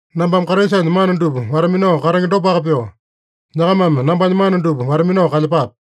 Nambame Kraisanya mana dupa wata-minao katenge dopaka pyoo, nyakamame nambanya mana dupa wata-minao kalyepape.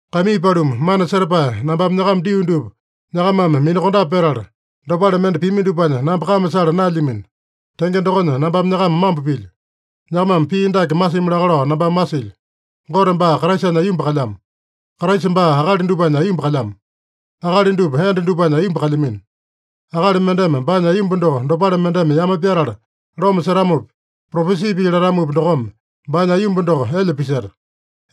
Kaimii paluma, mana setapae nambame nyakama dio dupa nyakamame minakondape petala, dopale mende pimi dupanya namba kame sala naelyamino. Tenge dokonya nambame nyakama mambo pilyo. Nyakamame pii dake masimi laka lao nambame masilyo: Gote baa Kraisanya aiyomba kalyamo. Kraisa baa akali dupanya aiyomba kalyamo. Akali dupa enda dupanya aiyomba kalyamino. Akali mendeme baanya aiyomba doko dopale mendeme yame pyatala loma setamopi, propesi pii latamopi dokome, baanya aiyomba doko elya piseta.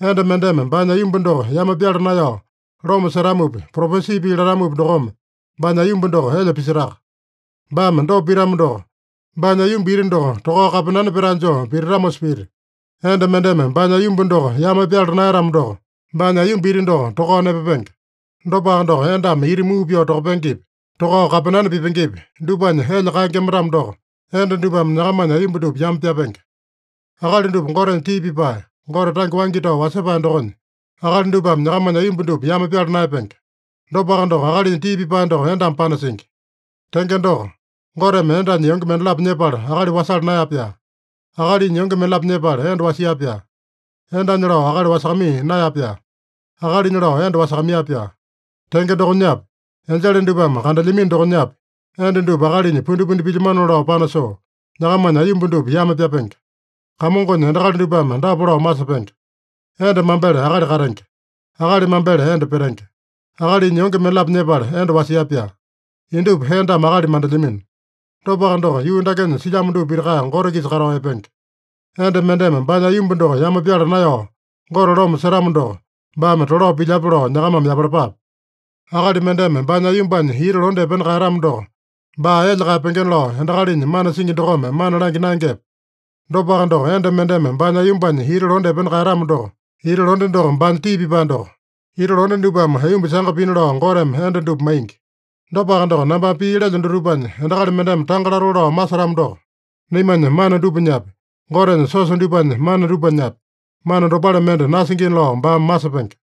Enda mendeme baanya aiyomba doko yame pyala naeyao loma setamopi, propesi pii latamopi dokome, baanya aiyomba doko elya pisetaka. Baame dopa pitamo doko, baanya aiyomba iti doko tokao kapenane petae joo pititamosa pita. Enda mendeme baanya aiyomba doko yame pyala naeyatamo doko, baanya aiyomba iti doko tokao nepapenge. Dopaka doko, endame iti muu pyoo tokapengepi, tokao kapenane pipengepi, dupanya elya kaengema-tamo doko, enda dupame nyakamanya aiyomba dupa yame pyapenge. Akali dupa Gotenya tii pipae, Gote tange waingi tao wasepae dokonya, akali dupame nyakamanya aiyomba dupa yame pyala naeyapenge. Dopaka doko, akalinya tii pipae doko endame panasingi. Tenge doko, Goteme endanya yonge mendalapo nyepala akali wasala naeya-pyaa. Akalinya yonge mendalapo nyepala enda wasia-pyaa. Endanya lao akali wasakamaiya naeya-pyaa. Akalinya lao enda wasakamaiya-pyaa. Tenge dokonyapi, enjele dupame kandelyamino dokonyapi, enda dupa akalinya pundipundi pilyamanona lao panasoo, nyakamanya aiyomba dupa yame pyapenge. Kamongonya endakali dupame dapa lao masepenge: Enda mambele akali katenge. Akali mambele enda petenge. Akalinya yonge mendalapo nyepala enda wasia-pyaa. Indupa endame akali mandelyamino. Dopaka doko, yuu dakenya silyamo dupa pitaka Gote-kisa katao epenge. Enda mendeme baanya aiyomba doko yame pyala naeyao Gote loma setamo doko, baame tolao pilyape lao nyakamame yapalapape. Akali mendeme baanya aiyombanya iti londe epena kaeyatamo doko, baa elya kaeyapengena lao endakalinya mana singi dokome mana langya naengepe? Dopaka doko, enda mendeme baanya aiyombanya iti londe epena kaeyatamo doko, iti londe doko baanya tii pipae doko. Iti londe dupame aiyomba sanga pina lao Goteme enda dupa maingi. Dopaka doko, nambame pii lelyo dutupanya endakali mendeme tanga latoo lao masetamo doko, naimanya mana dupanyapi, Gotenya siosa dupanya mana dupanyapi, mana dopale mende nasingina lao baame masepenge.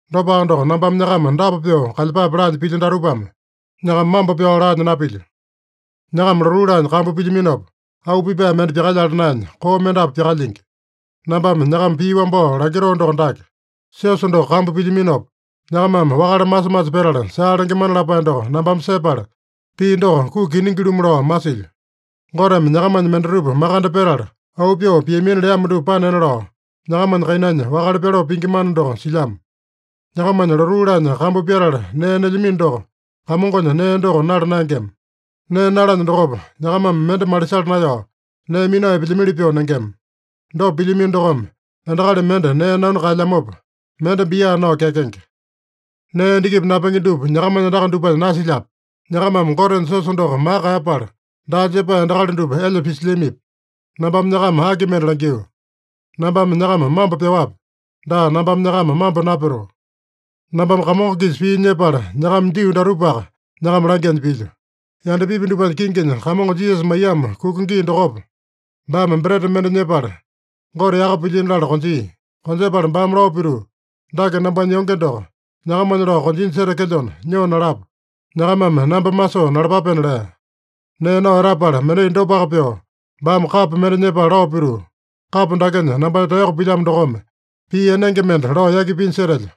Dopaka doko, nambame nyakama dapa pyoo kalyepape laanya pilyo datupame, nyakama mambo pyao laanya napilyo. Nyakama lotuu laanya kambu pilyaminopa, auu pipae mende pyakalyala naenya, koo mendapu pyakalyingi. Nambame nyakama pii wambao langitoo doko dake: Siosa doko kambu pilyaminopa, nyakamame wakale masa-masa petala saa lengemana lapae doko nambame sepala, pii doko kuki kiningi-lumu lao masilyo. Goteme nyakamanya mendatupa makande petala, auu pyoo piamina leamo dupa panena lao, nyakamanya kainanya wakale pyaloo pingi mana doko silyamo. Nyakama lotuu laanya kambu pyatala nee nelyamino doko, Kamongonya nee doko nala naengema. Nee nalanya dokopa, nyakamame mende malisala naeyao, nee minao epelyamili pyoo nengema. Dopa pilyamino dokome, endakali mende nee nanu kaelyamopa, mende bia nao kyakenge. Nee endakipi napenge dupa nyakamanya andaka dupanya nasilyape? Nyakamame Gotenya siosa doko maka kaeyapala, daa jepae endakali dupa elya pisilyamipi? Nambame nyakama aki mende langyuu? Nambame nyakama mambo pyaowape? Daa, nambame nyakama mambo napyatoo. Nambame Kamongo-kisa pii nyepala nyakama dio datupaka nyakama langyanya pilyo: Yandapipi dupanya kinginya Kamongo Jisasa maiyamo kuka gii dokopa, baame breta mende nyepala, Gote yaka pilyino latala konjia. Konjepala baame lao pituu, “Dake nambanya yonge doko, nyakamanya lao konjinya setekelyona, nyoo nalapa. Nyakamame namba masoo nalapapena” lea. Nee nao etapala, mendai dopaka pyoo baame kapo mende nyepala lao pituu, “Kapo dakenya nambanya taeyoko pilyamo dokome, pii enenge mende lao yaki pinya setelyo.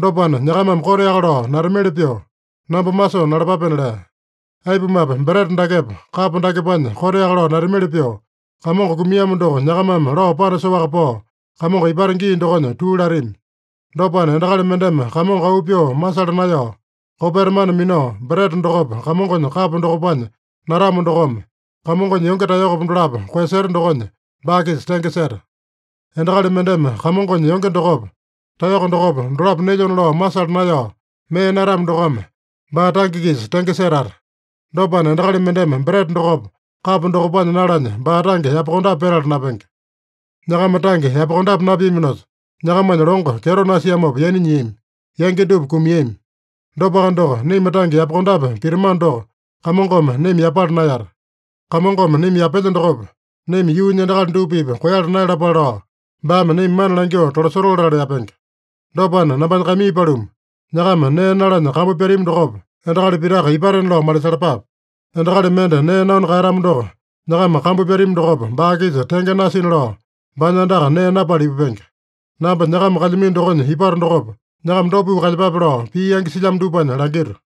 Dopana, nyakamame koteaka lao natamili pyoo, namba masoo nalapapena” lea. Aipumape, breta dakepa, kapo dakepanya koteaka lao natamili pyoo, Kamongo kumiamo doko nyakamame lao panasoaka pao, Kamongo ipata gii dokonya tuu latami. Dopana, endakali mendeme Kamongo auu pyoo masala naeyao, kopeta mana minao, breta dokopa, Kamongonya kapo dokopanya natamo dokome, Kamongonya yonge taeyokopa dolapo koeyaseta dokonya, baa-kisa tenge seta. Endakali mendeme Kamongonya yonge dokopa, taeyoko dokopa, dolapo nelyona lao masala naeyao, mee natamo dokome, baa tange-kisa tenge setata. Dopana, endakali mendeme breta dokopa, kapo dokopanya nalanya baa tange yapakondape petala napenge. Nyakama tange yapakondape napiaminosa, nyakamanya longo kyeto nasiamopa yaina nyiami. Yangi dupa kumiami. Dopaka doko, naima tange yapakondape pitamano doko, Kamongome naima yapala naeyata. Kamongome naima yapelya dokopa, naima yuunya endakali dupa-pipa koeyala naeyalapale lao, baame naima mana langyoo tolasotoo latala yapenge. Dopana, nambanya kaimii paluma, nyakama nee nalanya kambu pyatami dokopa, endakali pitaka ipatena lao malisalapape. Endakali mende nee nanu kaeyatamo doko, nyakama kambu pyatami dokopa baa-kisa tenge nasina lao, baanya andaka nee napala ipupenge. Namba nyakama kalyamino dokonya ipato dokopa, nyakama dopa pyoo kalyepape lao pii yangi silyamo dupanya langito.